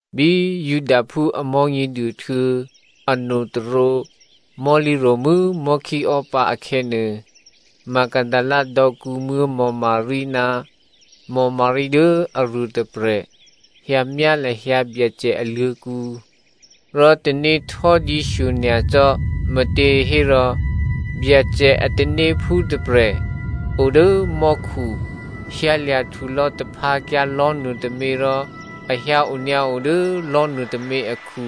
Bí Judaphú a Mò̤́nyěduô htuô̌ anotôrǒ mò̤́lǐ ro̤mû́ mò̤́khíò́pǎ akhè̌nuô, Magdalena dò̌kǔmuố̤ Maria ná Maria dố aruôtôprè̤ hyǎmyá lahyǎ Byacè aluô̤̌kǔ. Rò tanéhtò́dǐ shyonyacò́, me̤těhérò Byacè a tanéphú tôprè̤ o dố mò́khu hyǎlya̤ htulò̌ taphǎkyǎ lò̤́nuô tômě rò a hyǎ onyǎo dố lò̤́ nuôtômě akhu.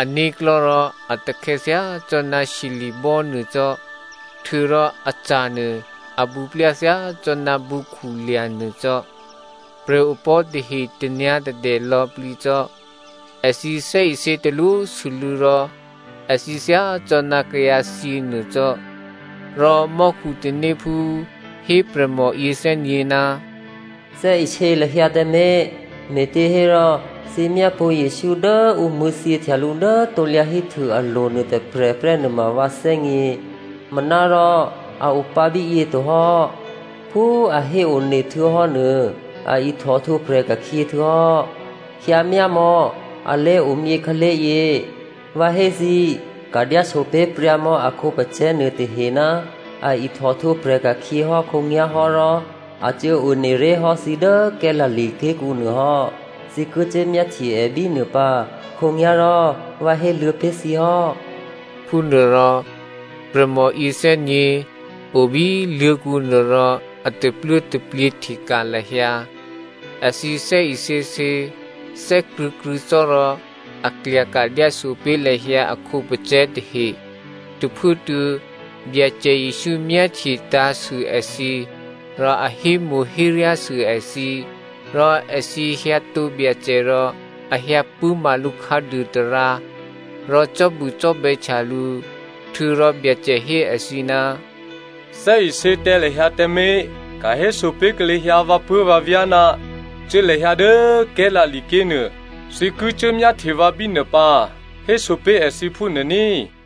Ané̤klò̤́ rò a takhè̌ thyácò́ná shyeli̤bò́ nuô cò́, htuô̌rò aca̤nuô a bǔplya thyácò́ná bǔkhu lya̤ nuô cò́. Prè̤opò̤́ tahe tanyǎ̤tadè lò̌plǐ cò́. Èthǐ thè́isě talwósû́lû̌ rò èthǐ thyá cò́ ná kayǎthyě nuô cò́. Rò mò́khu tanéphú hé prè̤mò yěthè́nyě̤, “Thè́isě lahyǎ tǎmé̤, me̤těhérò thǐ myápṳ̌ Jesǔ dố ǔ mṳ̂̌thyěhtya lǔ dố krusu alo̤ nuôtôprè̤ prè́ nuôma vǎ thè́gně. Manárò a opǎ bíyě tohò́. Phú a héone htuô̌hò́ nuô, a ihtòhtwǒprè̤ ka̤khyě htuô̌hò́. Hyǎmyámò̌ a lé̤omyě khǎlé̤yě. Vǎ hé thǐ꤮ ka̤dyáso pé̤ pryǎmò̌ a khǒpacè̤̌ nuôtahe, ‘A ihtòhtwǒprè̤ ka̤khyě hò́ khǒnyá̤ hò́ rò a cuố one ré̤ hò́ thǐ dố Galilea ké̤kǔ nuô hò́, thǐ ki cuốmyáhtye è bínuô pǎ,’ khǒnyá̤ rò vǎ héluô̌ pé̤ thǐ hò́.” Phúnuôrò prè̤mò yěthè́nyě̤ o bí luô̤̌kǔ nuô rò a tapluố̤taplyě hteka̤ lahyǎ. Èthǐ thè́isěsě, thè́krṳ̂̌krṳ̂̌ cò́ rò a klyaka̤ dyáso pé̤ lahyǎ a khǒpacè̤̌ tahe. Tôphuốtuô̌ Byacè Jesǔ myáhtye tǎ̤sû èthǐ rò a hémo̤héryásû èthǐ. Rò èthǐ hyǎtǒ Byacè rò a hyǎ pṳ̂́ma lǔ khǎduô tarǎ rò cò́bucò́bè̌htya lǔ. Htuô̌rò Byacè hé èthǐ, “Thè́isě tǎ lahyǎ tǎmé̤. Ka̤héso pé̤ lahyǎ vǎpuố̤vǎvyá̤, cuố lahyǎ dố Galilea ké̤ nuô, thǐ ki cuốmyáhtye vǎ bínuô pǎ, hésopé̤ èthǐ phúnuô ní꤮.”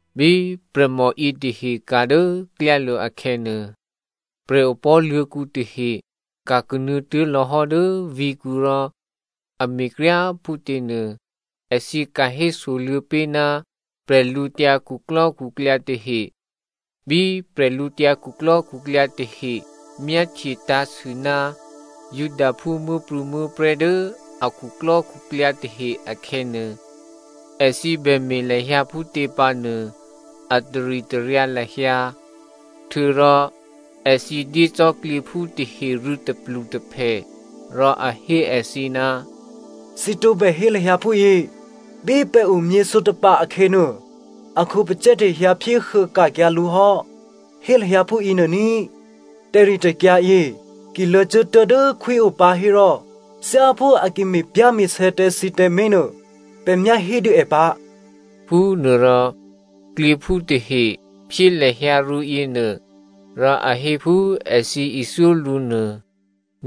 Bí prè̤mò yětahe ka̤ dố klyálo̤ akhè̌nuô, prè̤opò̤́ luô̤̌kǔ tahe ka̤ kanuô̌ tuố̤lò̌ hò́ dố vǐ̤kǔ rò a me̤kryá꤮ phútěnuô, èthǐ ka̤ hésoluô̌ pé̤ ná bwídukhu tahe. Bí bwídukhu tahe myáhtye tǎ̤sû ná Judaphú muố̤prû̌muố̤prè̤́ dố a khuklò́khuklyǎ tahe akhè̌nuô, èthǐ bè me̤ lahyǎ phútě pǎnuô a taritaryǎ lahyǎ. Htuô̌rò èthǐ dyé cò́ klyěphú tahe rû̌ tôplutôphè rò a hé èthǐ, “Thǐ tǒbè hé lahyǎ phúyě, ‘Bí pè̤ omyě sǒtapa̤ akhè̌nuô, a khǒpacè̤̌ tahe hyǎphyéhuô ka̤kyǎ lǔ hò́,’ hé lahyǎ phúyě nuô ní꤮. Tè̤ritè̤kyǎ yě ki luô̌cuốtuố̤ dố khwí o pǎ hérò thyáphú a ki me̤pyá̤me̤sè̌ tǎ thǐ tǎmé̤nuô, pè̤ myá hédû è pǎ.” Phúnuôrò klyěphú tahe phyé lahyǎ rû̌ yěnuô rò a hé phú èthǐ ithyó lǔ nuô.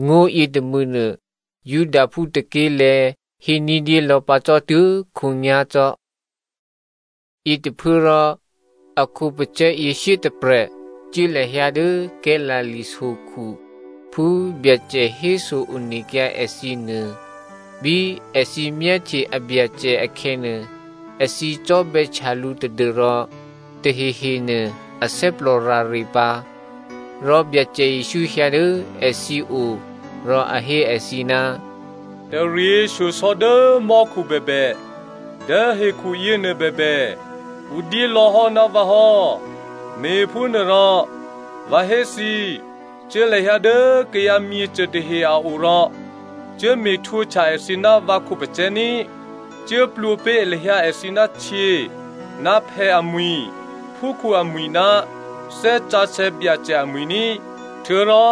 Ngó̤ yětômû̌nuô Judaphú tôké̤lè̤̌ hé ní̤dyé lò̌pǎ cò́ tuố̤khǒnyá̤ cò́. Yětôphuốrò a khǒpacè̤̌ yě shyétôprè̤ cuố lahyǎ dố Galilea sokhu phú Byacè héso onekyǎ èthǐ nuô. Bí èthǐ myáhtye a Byacè akhè̌nuô, èthǐ cò́bè̌htya lǔ tadû́rò tahehe nuô athè́plò rare pǎ. Rò Byacè Jesǔ hyǎ dố èthǐ o rò a hé èthǐ, “Taryěshyosò̌ dố mò́khu bèbè, dố hekhuyěnuô bèbè, ǔ dyé lò̌hò́ ná vǎ hò́. Me̤phúnuôrò, vǎ hé thǐ꤮, cuố lahyǎ dố kayǎ myěcô tahe a o rò cuốme̤ htwǒhtya èthǐ ná vǎ khǒpacè̤̌ ní꤮. Cuố plwǒ pé̤ lahyǎ èthǐ htyě ná phè̌ amwi̤, phúkhǔ amwi̤ ná Thè́ Sǎsè̌ Byacè amwi̤ ní꤮. Htuô̌rò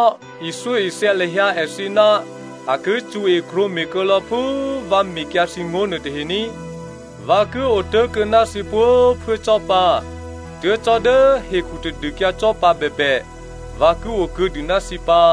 ithyóithya lahyǎ èthǐ ná a ki cṳ̌e krwǒme̤ kuô̌lò̌ phú vǎ mekyǎ thǐ ngó̤ nuôtahe ní꤮. Vǎ ki otố̤kuô̌ ná thǐ pwǒ̤꤮ phuố cò́ pǎ, tuố̤ cò́ dố hekhu tadûkyǎ cò́pǎ bèbè vǎ ki okuô̌dû ná thǐ pǎ.”